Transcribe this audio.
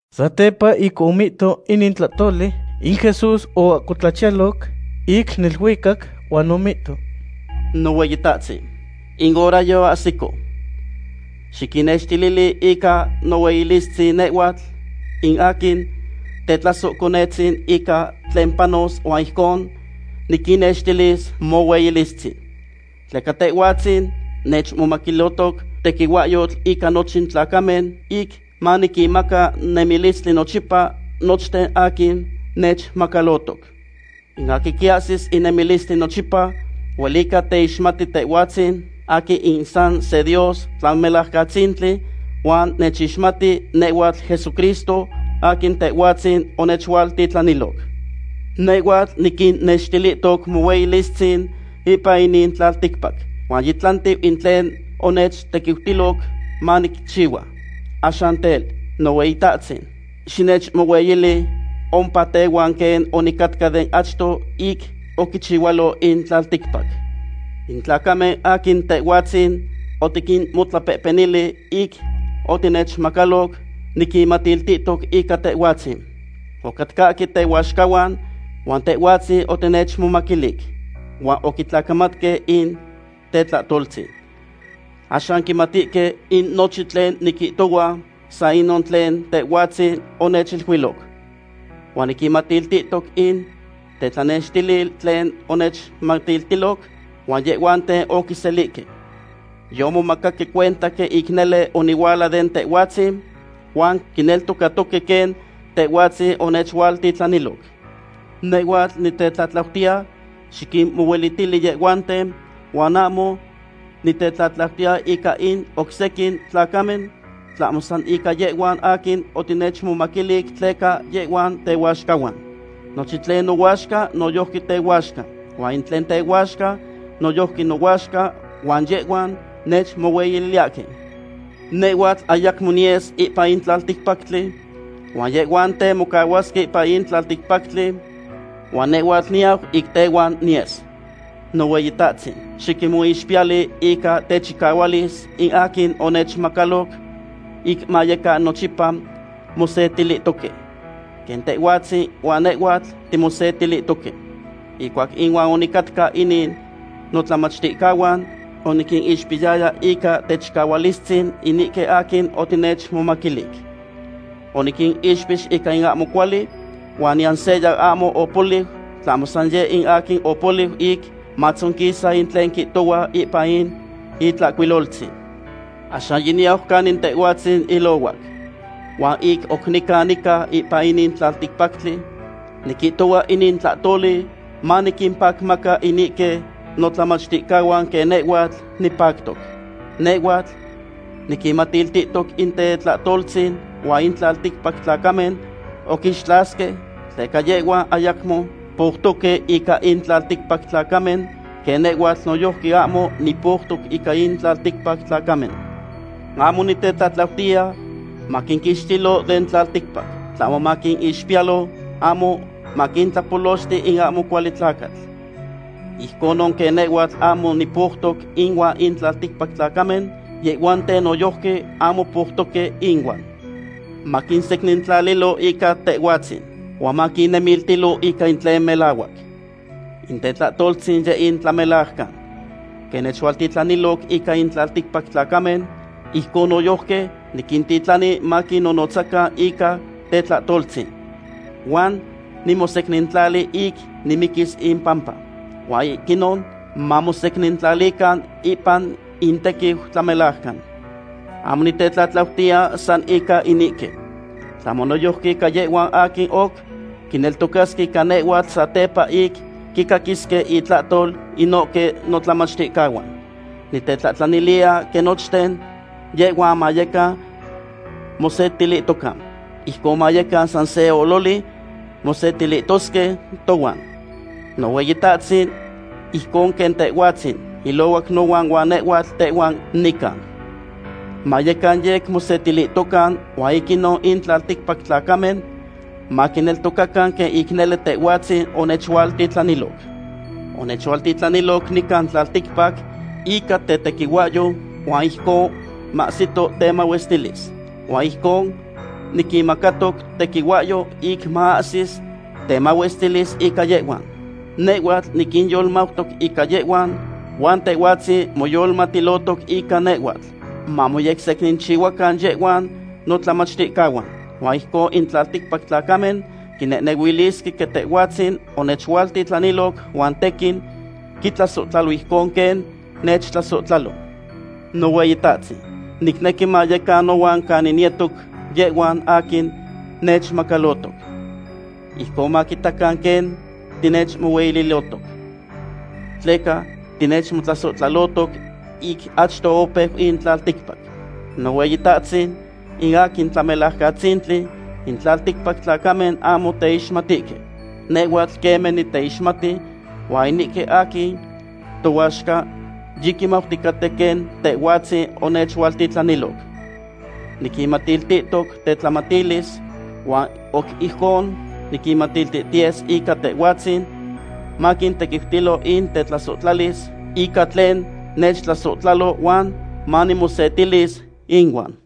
Satepa ic omihto inin tlahtoli, in Jesús oahcotlachiyaloc ic neluicac huan omihto: ―Nohueyitahtzin, in hora yoahsico. Xiquinnextilili ica nohueyilistzin nehhuatl in aquin tetlasohconetzin ica tlen panos huan ijcon niquinnextilis mohueyilistzin. Tleca Tehhuatzin nechmomaquilihtoc tequihuahyotl ica nochin tlacamen, ic maniquinmaca nemilistli nochipa nochten aquin nechmacalotoc. In aquin quiahsis in nemilistli nochipa huelica teixmati Tehhuatzin aquin in san se Dios Tlamelajcatzintli, huan nechixmati nehhuatl Jesucristo, aquin Tehhuatzin onechualtitlaniloc. ’Nehhuatl niquinnextilihtoc mohueyilistzin ipan inin tlalticpac, huan yitlantiu in tlen onechtequiutiloc manicchihua. Axan tel, Nohueyitahtzin, xinechmohueyili ompa tehuan quen onicatca den achto ic oquichihualo in tlalticpac. ’In tlacamen aquin Tehhuatzin otiquinmotlapehpenili ic otinechmomacaloc, niquinmatiltihtoc ica Tehhuatzin. Ocatcahque tehuaxcahuan, huan Tehhuatzin otinechmomaquilic, huan oquitlacamatque in tetlahtoltzin. Axan quimatihque in nochin tlen niquihtohua san inon tlen Tehhuatzin onechiluiloc. Huan niquinmatiltihtoc in tetlanextilil tlen onechmatiltiloc, huan yehhuanten oquiselihque. Yomomacaque cuenta quen ic nele onihuala den Tehhuatzin, huan quineltocatoque quen Tehhuatzin onechualtitlaniloc. ’Nehhuatl nitetlatlautiya xiquinmohuelitili yehhuanten, huan ahmo nitetlatlautiya ica in oc sequin tlacamen, tlahmo san ica yehhuan aquin otinechmomaquilic tleca yehhuan tehuaxcahuan. Nochin tlen nohuaxca noyojqui tehuaxca, huan in tlen tehuaxca noyojqui nohuaxca huan yehhuan nechmohueyiliyahque. ’Nehhuatl ayacmo niyes ipan in tlalticpactli, huan yehhuanten mocahuasque ipan in tlalticpactli huan nehhuatl niyau ic tehuan niyes. Nohueyitahtzin, xiquinmoixpiyali ica techicahualis in aquin onechmomacaloc ic mayecan nochipa mosetilihtoque, quen Tehhuatzin huan nehhuatl timosetilihtoque. Ihcuac inuan onicatca inin notlamachticahuan, oniquinixpiyaya ica techicahualistzin inihque aquin otinechmomaquilic. Oniquinixpix ica in ahmo cuali, huan niyan seya ahmo opoliu, tlahmo san yeh in aquin opoliu ic matzonquisa in tlen quihtohua ipan in Itlahcuiloltzin. ’Axan yiniyau canin Tehhuatzin ilohuac. Huan ic oc nican nica ipan inin tlalticpactli, niquihtohua inin tlahtoli maniquimpacmaca inihque notlamachticahuan quen nehhuatl nipactoc. Nehhuatl niquinmatiltihtoc in tetlahtoltzin huan in tlalticpac tlacamen oquinixtlasahque, tleca yehhuan ayacmo poutoque ica in tlalticpac tlacamen, quen nehhuatl noyojqui ahmo nipoutoc ica in tlalticpac tlacamen. Ahmo nitetlatlautiya maquinquixtilo den tlalticpac, tlahmo maquinixpiyalo, ahmo maquintlapolochti in ahmo cuali tlacatl. Ijconon quen nehhuatl ahmo nipoutoc inuan in tlalticpac tlacamen, yehhuanten noyojqui ahmo poutoque inuan. Maquinsecnintlalilo ica Tehhuatzin, huan maquinnemiltilo ica in tlen melahuac. In tetlahtoltzin yeh in tlamelajcan. Quen onechualtitlaniloc ica in tlalticpac tlacamen, ijcon noyojqui niquintitlani maquinnonotzacan ica tetlahtoltzin. Huan nimosecnintlali ic nimiquis impampa, huan ic inon mamosecnintlalican ipan intequiu tlamelajcan. ’Ahmo nitetlatlautiya san ica inihque, tlahmo noyojqui ica yehhuan aquin oc quineltocasque ica nehhuatl satepa ic quicaquisque intlahtol inohque notlamachticahuan. Nitetlahtlaniliya quen nochten yehhuan mayecan mosetilihtocan. Ijcon mayecan san se ololi mosetilihtosque tohuan, Nohueyitahtzin, ijcon quen Tehhuatzin ilohuac nohuan huan nehhuatl tehuan nica. Mayecan yec mamosetilihtocan huan ic inon in tlalticpac tlacamen maquineltocacan quen ic nele Tehhuatzin onechualtitlaniloc. Onechualtitlaniloc nican tlalticpac ica tetequihuahyo huan ijcon mahsitoc temahuestilis. Huan ijcon niquinmacatoc notequihuahyo ic maahsis temahuestilis ica yehhuan. Nehhuatl niquinyolmautoc ica yehhuan, huan Tehhuatzin moyolmatilotoc ica nehhuatl, mamoyecsechihuacan yehhuan notlamachticahuan. Huan ijcon in tlalticpac tlacamen quinehnehuilisque quen Tehhuatzin onechualtitlaniloc, huan tequin quintlasohtlalo ijcon quen nechtlasohtlalo. ’Nohueyitahtzin, nicnequi mayecan nohuan canin niyetos yehhuan aquin nechmacalotoc. Ijcon maquitacan quen tinechmohueyilihtoc. Tleca tinechmotlasohtlalohtoc ic achto opeu in tlalticpac. Nohueyitahtzin, in aquin Tlamelajcatzintli, in tlalticpac tlacamen ahmo teixmatihque. Nehhuatl queme niteixmati, huan inihque aquin tohuaxca yiquimauticaten quen Tehhuatzin onechualtitlaniloc. Niquinmatiltihtoc tetlamatilis, huan oc ijcon niquinmatiltihtiyes ica Tehhuatzin, maquintequiutilo in tetlasohtlalis ica tlen nechtlasohtlalo huan manimosetilis inuan.